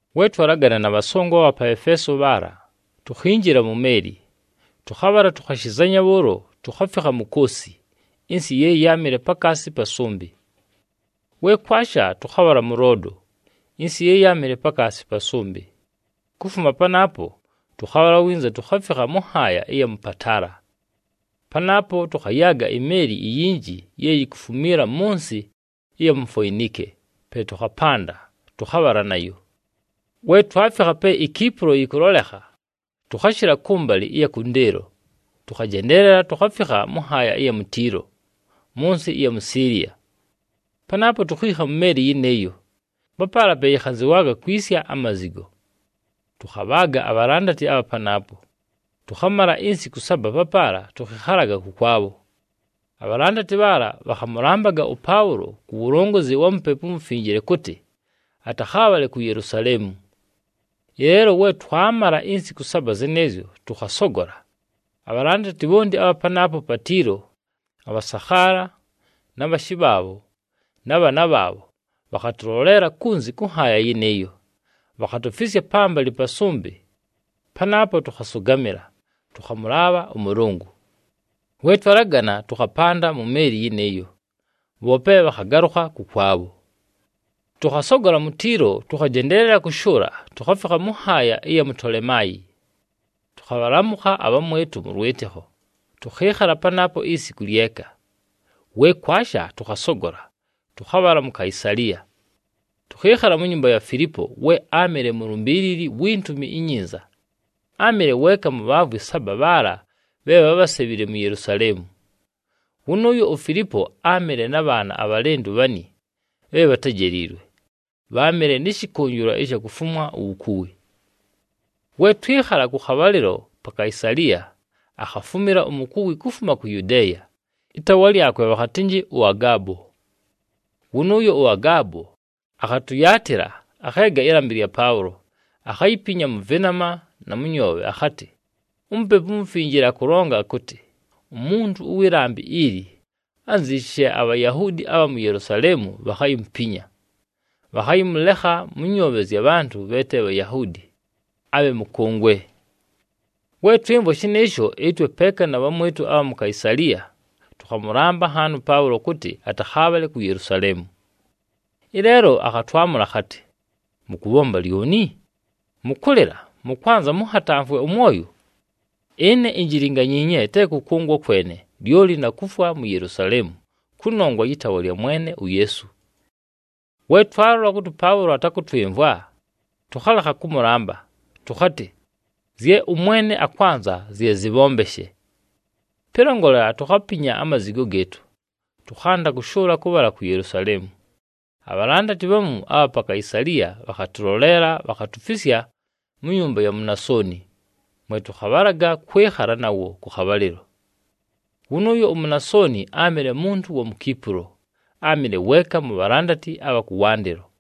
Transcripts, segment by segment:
We twalagana na bhasongo abha pa Efeeso bhaala, tukhinjila mu meeli, tʉkhabhala tukhashizanya bhʉʉlo, tukhafikha mu Koosi ɨnsɨ ye yáamɨle pakaasi pa sʉmbɨ. We kwasha, tʉkhabhala mʉ Loodo ɨnsɨ ye yáamɨle pakaasi pa sʉmbɨ. Kufuma panaapo, tʉkhabhala winza tukhafikha mʉ nhaaya ɨya mʉ Patala. Panaapo tʉkhayaaga imeeli iyinji ye yikufumiila mʉ nsɨ ɨya mu Foinike, pe tʉkhapanda, tʉkhabhala nayo. We twafikha pe iKipulo yɨkʉlolekha, tʉkhashɨla kʉmbalɨ ɨya kʉndɨɨlo, tʉkhajendeelela tukhafikha mʉ nhaaya ɨya mu Tiilo, mʉ nsɨ ɨya mu Siiliya. Panaapo, tukhiikha mu meeli yɨnɨɨyo, papaala pe yɨkhanzɨwaaga kwisya amazigo. Tʉkhabhaaga abhalandati abha panaapo, tʉkhamala insiku saba papaala tʉkhɨkhalaga kʉkwabho. Abhalandati bhaala bhakhamʉlambaga ʉPaʉlo ku wulongozi wa Mupepu uMufinjile kʉtɨ atakhaabhale ku Yelusaleemu. Ɨleelo we twamala insiku saba zɨnɨɨzyo, tʉkhasogola. Abhalandati bhonti abha panaapo pa Tiilo, abhasakhaala, na bhashɨ bhaabho, na bhaana bhaabho, bhakhatʉloleela kunzi kʉ nhaaya yɨnɨɨyo, bhakhatufisya pambalɨ pa sʉmbɨ. Panaapo tʉkhasʉgamɨla, tʉkhamʉlaabha ʉMʉlʉngʉ. We twalagana, tʉkhapanda mu meeli yɨnɨɨyo, bhoope bhakhagalʉkha kʉkwabho. Tʉkhasogola mu Tiilo, tʉkhajendeelela kʉshʉʉla tukhafikha mʉ nhaaya ɨya mu Tolemaayi. Tʉkhabhalamʉkha abhamwɨtʉ mʉ lwɨtɨkho, tʉkhɨɨkhala panaapo isiku lyeka. We kwasha, tʉkhasogola, tʉkhabhala mu Kaisaliya. Tʉkhɨɨkhala mu nyumba ya Filipo we áamɨle mulumbiilili wi Ntumi iNyinza, áamɨle weeka mu bhaavwi saba bhaala bhe bhábhasebhile mu Yelusaleemu. Wʉnʉʉyo uFilipo áamɨle na bhaana abhalɨndʉ bhani bhe bhatejeliilwe, bháamɨle nɨ shɨkʉnjɨlwa ɨsha kufumwa uwukuwi. We twɨkhala kʉ khabhalɨlo pa Kaisaliya, akhafumila umukuwi kufuma ku Yudeeya, ɨtaawa lyakwe bhakhatɨnjɨ ʉAgaabo. Wʉnʉʉyo ʉAgaabo akhatʉyaatɨla, akheega ɨlambɨ lya Paʉlo, akhayipinya mʉ vɨnama na mʉ nyoobhe, akhatɨ, “UMupepu uMufinjile akʉlonga akʉtɨ, ‘Umuntu ʉwɨ lambɨ ili, anziishi she aBhayahuudi abha mu Yelusaleemu bhakhayimupinya, bhakhayɨmʉlekha mʉ nyoobhe zya bhantʉ bhe te Bhayahuudi abhe mʉkʉngwe.’” We twɨmvwa shɨnɨɨsho, ɨtwe peeka na bhamwɨtʉ abha mu Kaisaliya, tʉkhamʉlamba nhaani ʉPaʉlo kʉtɨ atakhaabhale ku Yelusaleemu. Ɨleelo akhatwamʉla akhatɨ, “Mʉkʉbhomba lyoni? Mʉkʉlɨla, mʉkwanza mʉnhatamfwe ʉmwoyo? Ɨne injilinganyiinye te kʉkʉngwa kwene, lyoli na kufwa mu Yelusaleemu kʉnongwa yɨ taawa lya Mwene uYeesu.” We twalola kʉtɨ ʉPaʉlo atakʉtwɨmvwa, tʉkhalekha kʉmʉlamba tʉkhatɨ, “Zye ʉMwene akwanza zye zɨbhombeshe.” Pɨlongolela, tukhapinya amazigo gɨɨtʉ, tʉkhanda kʉshʉʉla kʉbhala ku Yelusaleemu. Abhalandati bhamu abha pa Kaisaliya bhakhatʉloleela bhakhatufisya mu nyumba ya Munasoni, mwe tʉkhabhalaga kwɨkhala nawo kʉ khabhalɨlo. Wʉnʉʉyo uMunasoni áamɨle muntu wa mu Kipulo, áamɨle weeka mu bhalandati abha kʉwandɨlo.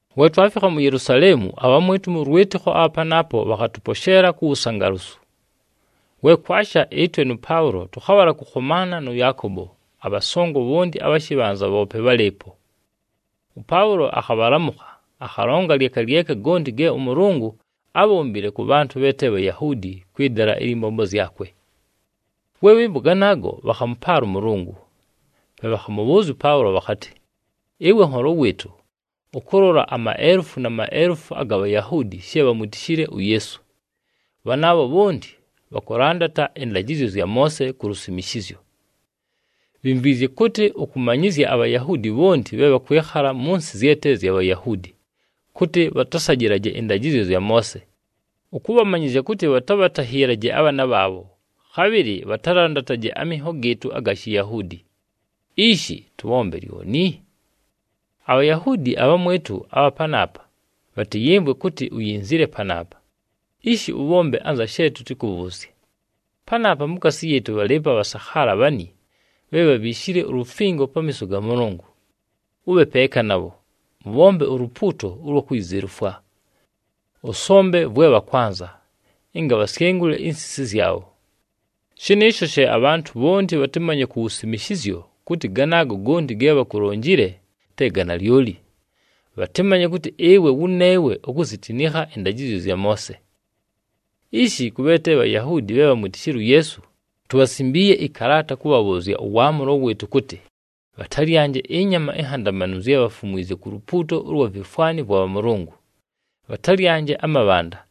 We twafikha mu Yelusaleemu, abhamwɨtʉ mʉ lwɨtɨkho abha panaapo bhakhatʉposheela ku wusangalusu. We kwasha, ɨtwe nʉ Paʉlo tʉkhabhala kʉkhomaana nʉ Yaakobo, abhasongo bhonti abha shɨbhanza bhoope bhálɨɨpo. ɄPaʉlo akhabhalamʉkha, akhalonga lyeka lyeka gonti ge ʉMʉlʉngʉ ábhombile kʉ bhantʉ bhe te Bhayahuudi kwɨ dala ɨlyɨ mbombo zyakwe. We bhɨmvwa ganaago, bhakhamʉpaala ʉMʉlʉngʉ. Pe bhakhamʉbhʉʉzya ʉPaʉlo bhakhatɨ, “Ɨwe nholo wɨɨtʉ, ʉkʉlola amaelufu na maelufu aga Bhayahuudi she bhamwitishile uYeesu. Bhanaabho bhonti bhakʉlandata ɨndajɨzyo zya Moose ku lusimishizyo. Bhimvwizye kʉtɨ ʉkʉmanyɨzya aBhayahuudi bhonti bhe bhakwɨkhala mʉ nsɨ zye te zya Bhayahuudi kʉtɨ bhatasajɨlaje ɨndajɨzyo zya Moose, ʉkʉbhamanyɨzya kʉtɨ bhatabhatahiilaje abhaana bhaabho, khabhɨlɨ bhatalandataje aminho gɨɨtʉ aga Shiyahuudi. Ishi, tʉbhombe lyoni? ABhayahuudi abhamwɨtʉ abha panaapa bhatɨyɨmvwe kʉtɨ uyinzile panaapa. Ishi, ʉbhombe anza she tʉtɨkʉbhʉʉzye. Panaapa mukaasi yɨɨtʉ bhalɨɨpo abhasakhaala bhani bhe bhabhiishile ulufingo pamiiso ga Mʉlʉngʉ. Ʉbhe peeka nabho, mʉbhombe ulupuuto ʉlwa kuyizelufwa. Ʉsombe vwe bhakwanza, ɨnga bhasyengule insisi zyabho. Shɨnɨɨsho she abhantʉ bhonti bhatɨmanye ku wusimishizyo kʉtɨ ganaago gonti ge bhakulonjile, te ga nalyoli, bhatɨmanye kʉtɨ ɨwe wʉneewe ukuzitinikha ɨndajɨzyo zya Moose. Ishi, kʉ bhe te Bhayahuudi bhe bhamwitishile uYeesu, tubhasimbiiye ɨkalaata kʉbhabhʉʉzya ʉwaamʉlo wɨɨtʉ kʉtɨ bhatalyanje ɨnyama inhandamanu zye bhafumwizye ku lupuuto ʉlwa vifwani vwa bhamʉlʉngʉ, bhatalyanje amabhanda,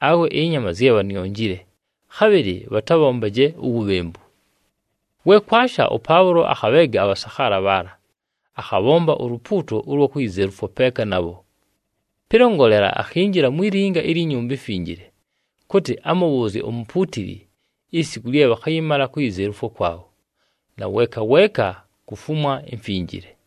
awe ɨnyama zye bhanionjile, khabhɨlɨ bhatabhombaje uwubhembu.” We kwasha, ʉPaʉlo akhabheega abhasakhaala bhaala, akhabhomba ulupuuto ʉlwa kuyizelufwa peeka nabho. Pɨlongolela, akhinjila mwi linga ilyi Nyumba iMfinjile, kʉtɨ amʉbhʉʉzye umupuutili isiku lye bhakhayɨmala kuyizelufwa kwabho, na weeka weeka kufumwa imfinjile.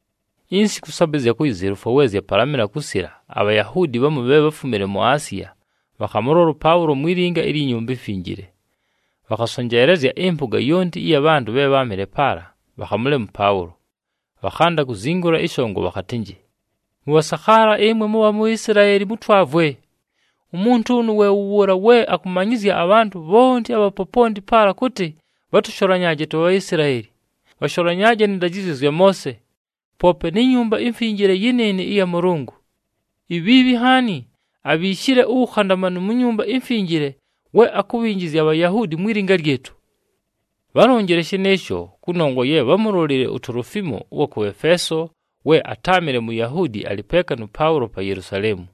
Insiku saba ɨzya kuyizelufwa, we zyapalamɨla kusila, aBhayahuudi bhamu bhe bháfumile mu Asiya bhakhamʉlola ʉPaʉlo mwi linga ilyi Nyumba iMfinjile. Bhakhasonjeelezya ɨmpʉga yonti ɨya bhantʉ bhe bháamɨle paala, bhakhamʉlema ʉPaʉlo, bhakhanda kuzingula ɨshongo bhakhatɨnjɨ, “Mʉbhasakhaala ɨmwe mʉbha mu Isilaeli, mʉtwavwe! Umuntu ʉnʉ we wʉ wʉʉla we akʉmanyɨzya abhantʉ bhonti abha poponti paala kʉtɨ bhatʉsholanyaaje tuBhaisilaeli, bhasholanyaaje nɨ ndajɨzyo zya Moose, poope ni Nyumba iMfinjile yɨnɨɨnɨ ɨya Mʉlʉngʉ. Ibhiibhi nhaani abhiishile uwukhandamanu mu Nyumba iMfinjile we akubhinjizya aBhayunaani mwi linga lyɨtʉ.” Bhálonjile shɨnɨɨsho, kʉnongwa ye bhámulolile uTolofiimo ʉwa kʉ Efeeso we atáamɨle Muyahuudi alɨ peeka nʉ Paʉlo pa Yelusaleemu.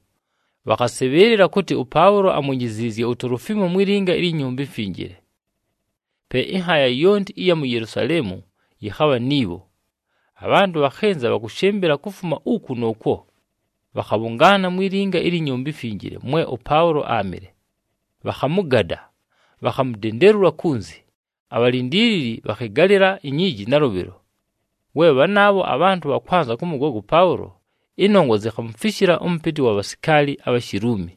Bhakhasɨbhɨɨlɨla kʉtɨ ʉPaʉlo amwinjiziizye uTolofiimo mwi linga ilyi Nyumba iMfinjile. Pe ɨnhaaya yonti ɨya mu Yelusaleemu yɨkhabha ni bho. Abhantʉ bhakhɨnza bhakʉshɨmbɨla kufuma uku nʉʉkwo, bhakhabhʉngaana mwi linga ilyi Nyumba iMfinjile mwe ʉPaʉlo áamɨle. Bhakhamʉgada, bhakhamudendelula kunzi, abhalindiilili bhakhɨgalɨla inyiiji nalʉbhɨlo. We bhanaabho abhantʉ bhakwanza kʉmʉgoga ʉPaʉlo, ɨnongwa zikhamufishila ʉmʉpɨtɨ wa bhasikaali abha Shiluumi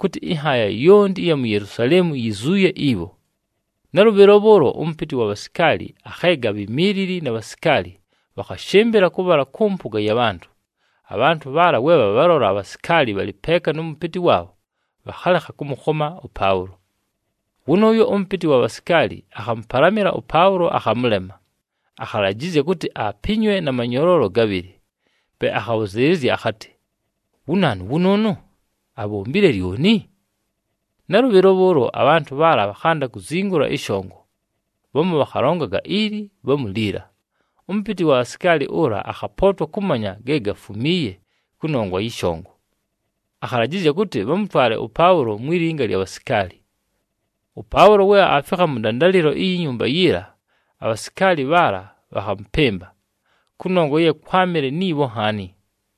kʉtɨ ɨnhaaya yonti ɨya mu Yelusaleemu yizuuye ibho. Nalʉbhɨlo bhʉʉlo ʉmʉpɨtɨ wa bhasikaali akheega abhimiilili na bhasikaali, bhakhashɨmbɨla kʉbhala kʉ mpʉga ya bhantʉ. Abhantʉ bhaala we bhabhalola abhasikaali bhalɨ peeka nʉ mʉpɨtɨ waabho, bhakhalekha kʉmʉkhoma ʉPaʉlo. Wʉnʉʉyo ʉmʉpɨtɨ wa bhasikaali akhamʉpalamɨla ʉPaʉlo akhamʉlema, akhalajɨzya kʉtɨ apinywe na manyoloolo gabhɨlɨ. Pe akhabhʉzɨɨlɨzya akhatɨ, “Wu naanu wʉnʉʉnʉ? Abhombile lyoni?” Nalʉbhɨlo bhʉʉlo abhantʉ bhaala bhakhanda kuzingula ɨshongo. Bhamu bhakhalongaga ili bhamu liila, ʉmʉpɨtɨ wa bhasikaali ʉla akhapootwa kʉmanya ge gafumiiye kʉnongwa yɨ shongo. Akhalajɨzya kʉtɨ bhamʉtwale ʉPaʉlo mwi linga lya bhasikaali. ɄPaʉlo we aafikha mʉ ndandalɨlo iyi nyumba yiila, abhasikaali bhaala bhakhamʉpɨmba, kʉnongwa ye kwámɨle ni bho nhaani.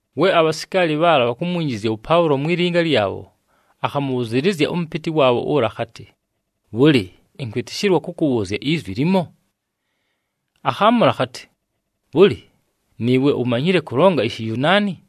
We abhasikaali bhaala bhakumwinjizya ʉPaʉlo mwi linga lyabho, akhamʉbhʉzɨɨlɨzya ʉmʉpɨtɨ waabho ʉla akhatɨ, “Bhʉlɨ, ɨnkwɨtɨshɨlwa kʉkʉbhʉʉzya izwi limo?” Akhaamʉla akhatɨ, “Bhʉlɨ, nɨɨwe umanyile kʉlonga iShiyunaani?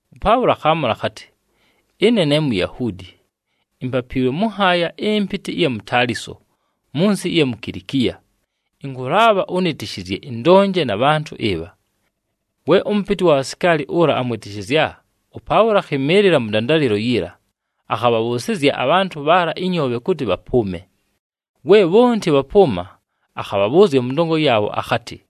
ɄPaʉlo akhaamʉla akhatɨ, “Ɨne ne Muyahuudi, impapiilwe mʉ nhaaya ɨmpɨtɨ ɨya mu Taliso mʉ nsɨ ɨya mu Kilikiya. Ɨnkʉlaabha ʉnɨtɨshɨzye ɨndonje na bhantʉ ɨbha.” We ʉmʉpɨtɨ ʉwa bhasikaali ʉla amwɨtɨshɨzya, ʉPaʉlo akhɨmɨɨlɨla mʉ ndandalɨlo yiila, akhabhabhʉʉsɨzya abhantʉ bhaala ɨnyoobhe kʉtɨ bhapʉʉme. We bhonti bhapʉʉma, akhabhabhʉʉzya mʉ ndongo yaabho akhatɨ,